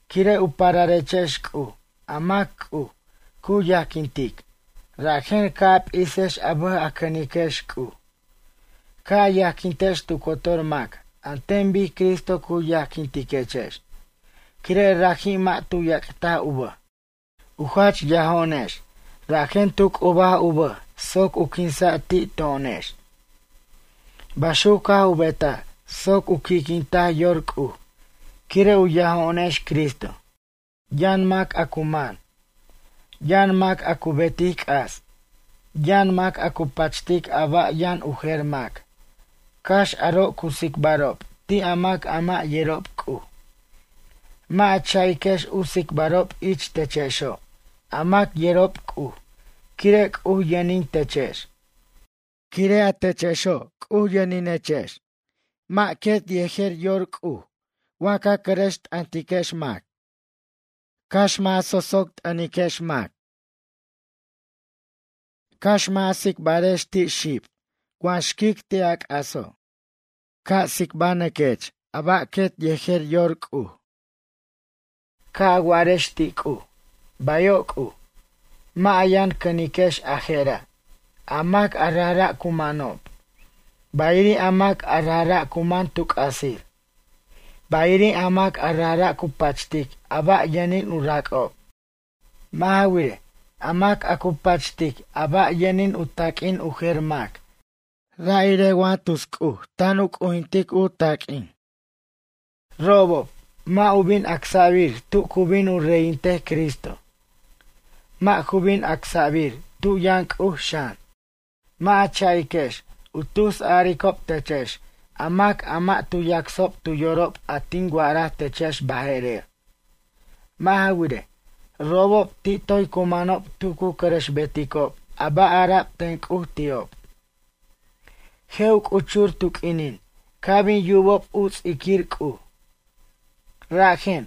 Quire' u pararechex C'uj a mac C'uj, cu yajquintic, rajen ca' a p'isex a bʌj a cʌniquex C'uj. Ca' a yajquintex tu cotor mac an ten bic Cristo cu yajquintechex, quire' raji mʌ' tu yac'taj u bʌj. U jach yajo'onex rajen tu c'ubaj u bʌj soc u quinsa' ti' to'onex. Baxuc caj u betaj soc u qui'quintaj yor C'uj quire' u yajo'onex Cristo. Yʌn mac a cu man. Yʌn mac a cu betic c'as. Yʌn mac a cu pachtic a ba' yʌn u jer mac, cax aro' cu tsicbarob ti' a mac a mʌ' yerob C'uj, mʌ' a cha'iquex u tsicbarob ich techexo' a mac yerob C'uj quire' C'uj yʌnin techex. Quire' a techexo' C'uj yʌninechex, mʌ' quet yejer yor C'uj wa ca cʌrʌx t'ʌntiquex mac, cax mʌ' a so'soc t'ʌntiquex mac, cax mʌ' a tsicbarex ti' xib wa xquic ti' a c'aso'. Ca' tsicbanʌquex a ba' quet yejer yor C'uj. Ca' a wa'arex ti' C'uj. “Bayo' C'uj.” Mʌ' a yʌn cʌniquex a je'ra'. A mac a rajra' cu manob, bayiri' a mac a rajra' cu man tu c'asir. Bayiri' a mac a rajra' cu pachtic a ba' yʌnin u rac'ob. Mʌ' ja wirej, a mac a cu pachtic a ba' yʌnin u taq'uin u jer mac ra' irej wa tus c'uj ten u c'ujintic u taq'uin. Robob, mʌ' u bin acsa'bir tu cu bin u reyintej Cristo. Mʌ' ju bin acsa'bir tu yʌn C'uj xan. Mʌ' a cha'iquex u tus aricob techex a mac a mʌ' tu yacsob tu yorob a tin wa'araj techex baje'rer. Mʌ' ja wirej, robob ti' toy cu manob tu cu cʌrʌxbeticob a ba' ara'b ten C'uj ti'ob. Je' u c'uchur tu q'uinin ca' bin yubob u ts'iquir C'uj. Rajen,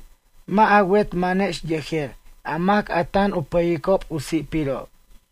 mʌ' a wet manex yejer a mac a tan u pʌyicob u si'pirob.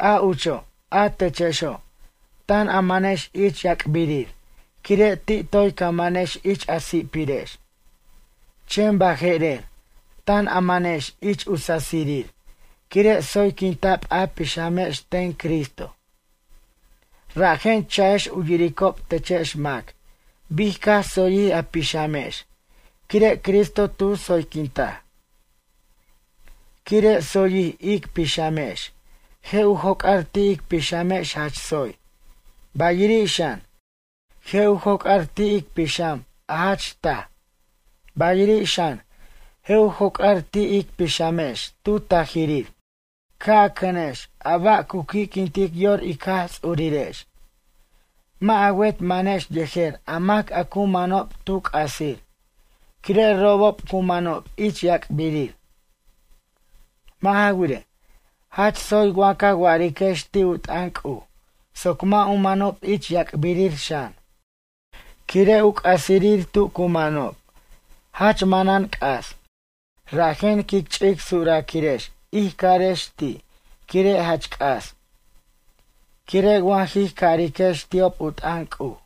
A ucho' a techexo' tan a manex ich yac'birir quire' ti' toy ca manex ich a si'pirex. Chen baje'rer, tan a manex ich u sasirir quire' tsoyquinta'b a pixamex ten Cristo. Rajen cha'ex u yiricob techex mac bic caj tsoyjij a pixamex quire' Cristo tu tsoyquintaj. Quire' tsoyjij ic pixamex, je' u joc'ar ti' ic pixamex jach tsoy, bayiri' xan, je' u joc'ar ti' ic pixam a jach taj, bayiri' xan je' u joc'ar ti' ic pixamex tu tajirir. Ca' a cʌnex a ba' cu qui'quintic yor ic Jaj Ts'urirex. Mʌ' a wet manex yejer a mac a cu manob tu c'asir quire' robob cu manob ich yac'birir. Mʌ' ja wirej, jach tsoy wa ca wa'ariquex ti' u t'ʌn C'uj soc mʌ' u manob ich yac'birir xan. Quire' u c'asirir tu cu manob, jach manan c'as, rajen quic ch'ic suraquirex ij carex ti' quire' jach c'as. Quire' wa jij cariquex ti'ob u t'ʌn C'uj,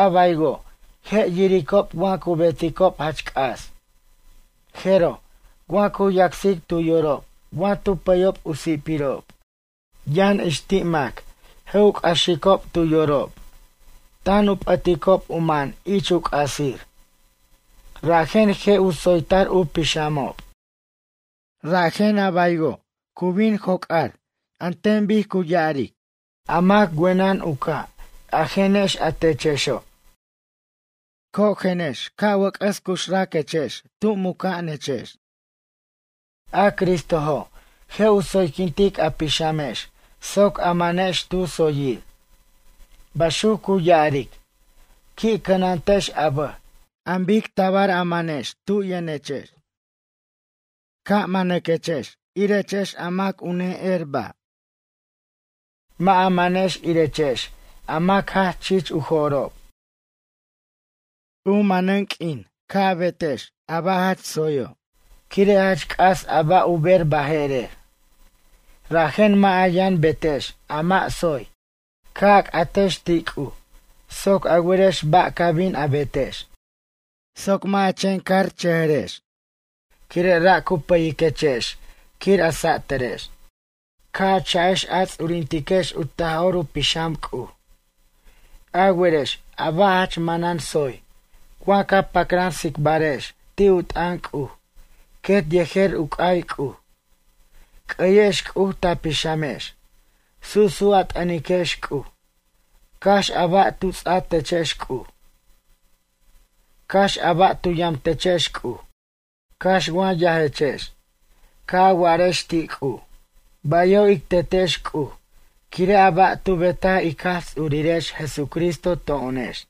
a baywo' je' yiricob wa cu beticob jach c'as. Jeroj, wa cu yacsicob tu yorob wa tu pʌyob u si'pirob, yʌn ix ti' mac je' u c'axicob tu yorob tan u p'ʌticob u man ich u c'asir, rajen je' u tsoytar u pixamob. Rajen, a baywo' cu bin joc'ar an ten cu ya'ar: A mac wenʌn u ca' ajenex a techexo'. Cojenex ca' wʌc'ʌs cuxraquex tu muca'anechex. A Cristojo', je' u tsoyquintic a pixamex soc a manex tu tsoyir. Baxuc cu ya'aric. Qui' cʌnantex a bʌj an bic tabar a manex tub yʌnechex. Ca' manaquex irechex a mac a u ne'er ba'. Mʌ' a manex irechex a mac jach chich u jo'rob. U manej q'uin ca' a betex a ba' jach tsoyo' quire' jach c'as a ba' u ber baje'rer. Rajen mʌ' a yʌn betex a mʌ' tsoy. Ca' a c'atex ti' C'uj soc a werex ba' ca bin a betex. Soc mʌ' a chen carchʌjʌrechex quire' ra' cu pʌyiquechex quir a satarex. Ca' a cha'ex a ts'urintiquex u Taj'or Pixam C'uj. A werex a ba' jach manan tsoy, wa ca pacran tsicbarex ti' u t'ʌn C'uj, quet yejer u c'ay C'uj. C'ʌyex C'uj ta pixamex. Su'su' a t'ʌniquex C'uj. Cax a ba' tu ts'a techex C'uj, cax a ba' tu yamtechex C'uj, cax wa yajechex, ca' a wa'arex ti' C'uj: “Bayo' ic Tetex C'uj quire' a ba' tu betaj ic Jaj Ts'urirex Jesucristo to'onex.”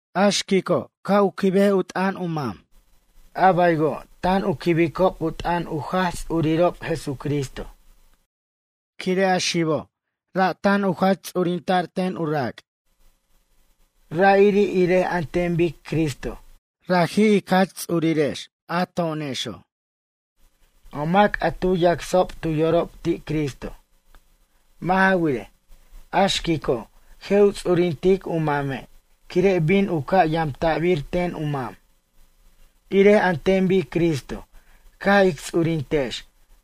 A xquico', ca' quib u t'ʌn u mam, a baywo' tan u quibicob u t'ʌn u Jaj Ts'urirob Jesucristo. Quire' a xibo', ra' tu jach ts'urinta'r ten u rac'. Ra'iri' irej an ten bic Cristo, raji' ic Jach Ts'urirex a to'onexo', a mac a tu yacsob tu yorob ti' Cristo. Mʌ' ja wirej, a xquico' je' u ts'urintic u mame' quire' bin u ca' yamta'bir ten u mam, irej an ten bic Cristo caj ic ts'urintex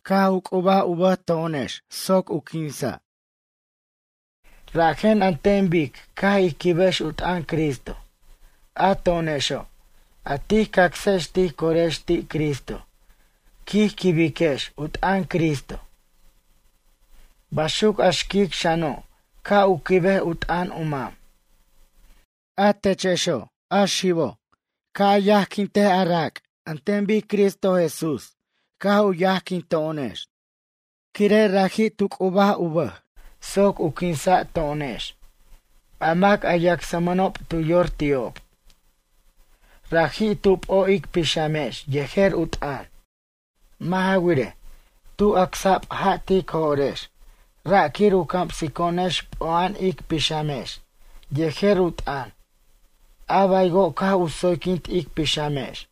caj u c'ub u bʌj to'onex soc u quinsa'. Rajen an ten bic ca' ij quibex u t'ʌn Cristo, a to'onexo', a tij cacsex tij corex ti' Cristo quij quibiquex u t'ʌn Cristo. Baxuc a xquic xano' ca' u quibej u t'ʌn u mam. A techexo', a xibo', ca' u yajquint a rac' an ten bic Cristo Jesús caj u yajquinto'onex, quire' raji' tu c'ub u bʌj soc u quinsa' to'onex, a mac a yacsmʌnob tu yor ti'ob. Raji' tu p'o' ic pixamex yejer u t'ʌn. Mʌ' ja wirej, tu acsa'b ja' tic jo'rex, ra' quir u camsico'onex p'o'a'an ic pixamex yejer u t'ʌn a baywo' caj u tsoyquint ic pixamex.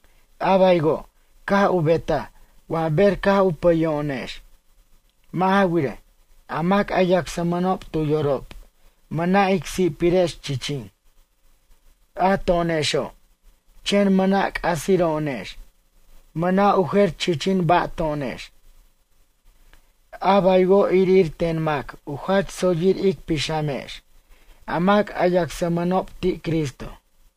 A baywo' caj u betaj wa ber caj u pʌyo'onex. Mʌ' ja wirej, a mac a yacsmʌnob tu yorob mʌna' ic si'pirex chichin, a to'onexo', chen mʌna' c'asiro'onex, mʌna' u jer chichin ba' to'onex. A baywo' irir ten mac u jach tsoyir ic pixamex a mac a yacsmʌnob ti' Cristo.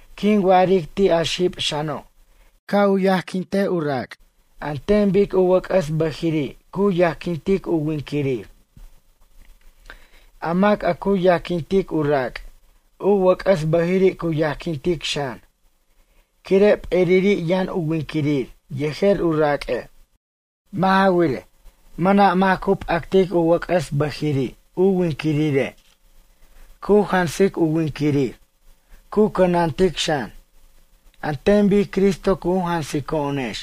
Quin wa'aric ti' a xib xano', ca' u yajquint u rac' an ten bic u wʌc'ʌs bʌjiri' cu yajquintic u winquirir. A mac a cu yajquintic u rac', u wʌc'ʌs bʌjiri' cu yajquintic xan, quire' p'eriri' yʌn u winquirir yejer u raq'ue'. Mʌ' ja wirej, mʌna' mac cu p'actic u wʌc'ʌs bʌjiri' u winquirire', cu jansic u winquirir, cu cʌnantic xan. An ten bic Cristo cu jansico'onex,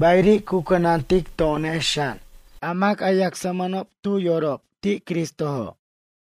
bayiri' cu cʌnantic to'onex xan a mac a yacsmʌnob ti' Cristojo' tu yorob.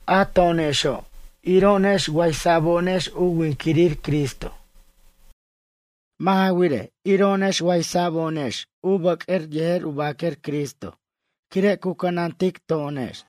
A to'onexo' iro'onex waysa'bo'onex u winquirir Cristo. Mʌ' ja wirej, iro'onex waysa'bo'onex u bʌq'uer yejer u baquer Cristo quire' cu cʌnantic to'onex.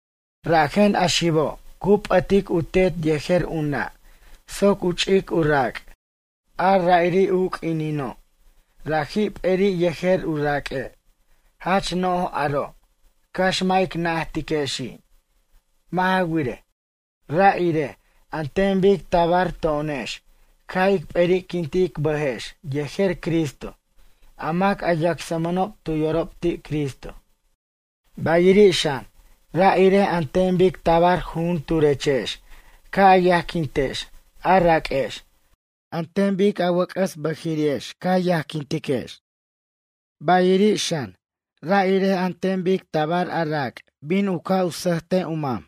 “Rajen a xibo' cu p'ʌtic u tet yejer u nʌ' soc u ch'ic u rac'. A ra'iri' u q'uinino', raji' p'eri' yejer u raq'ue'.” Jach no'j aro' cax mʌ' ic najtiquexi'. Mʌ' ja wirej, ra' irej an ten bic tabar to'onex caj ic p'eri'quint ic bʌjex yejer Cristo, a mac a yacsmʌnob tu yorob ti' Cristo. Bayiri' xan, ra' irej an ten bic tabar jujunturechex ca' a yajquintex a raq'uex an ten bic a wʌc'ʌs bʌjiri'ex ca yajquintex. Bayiri' xan, ra' irej an ten bic tabar a rac' bin u ca' sʌjt u mam.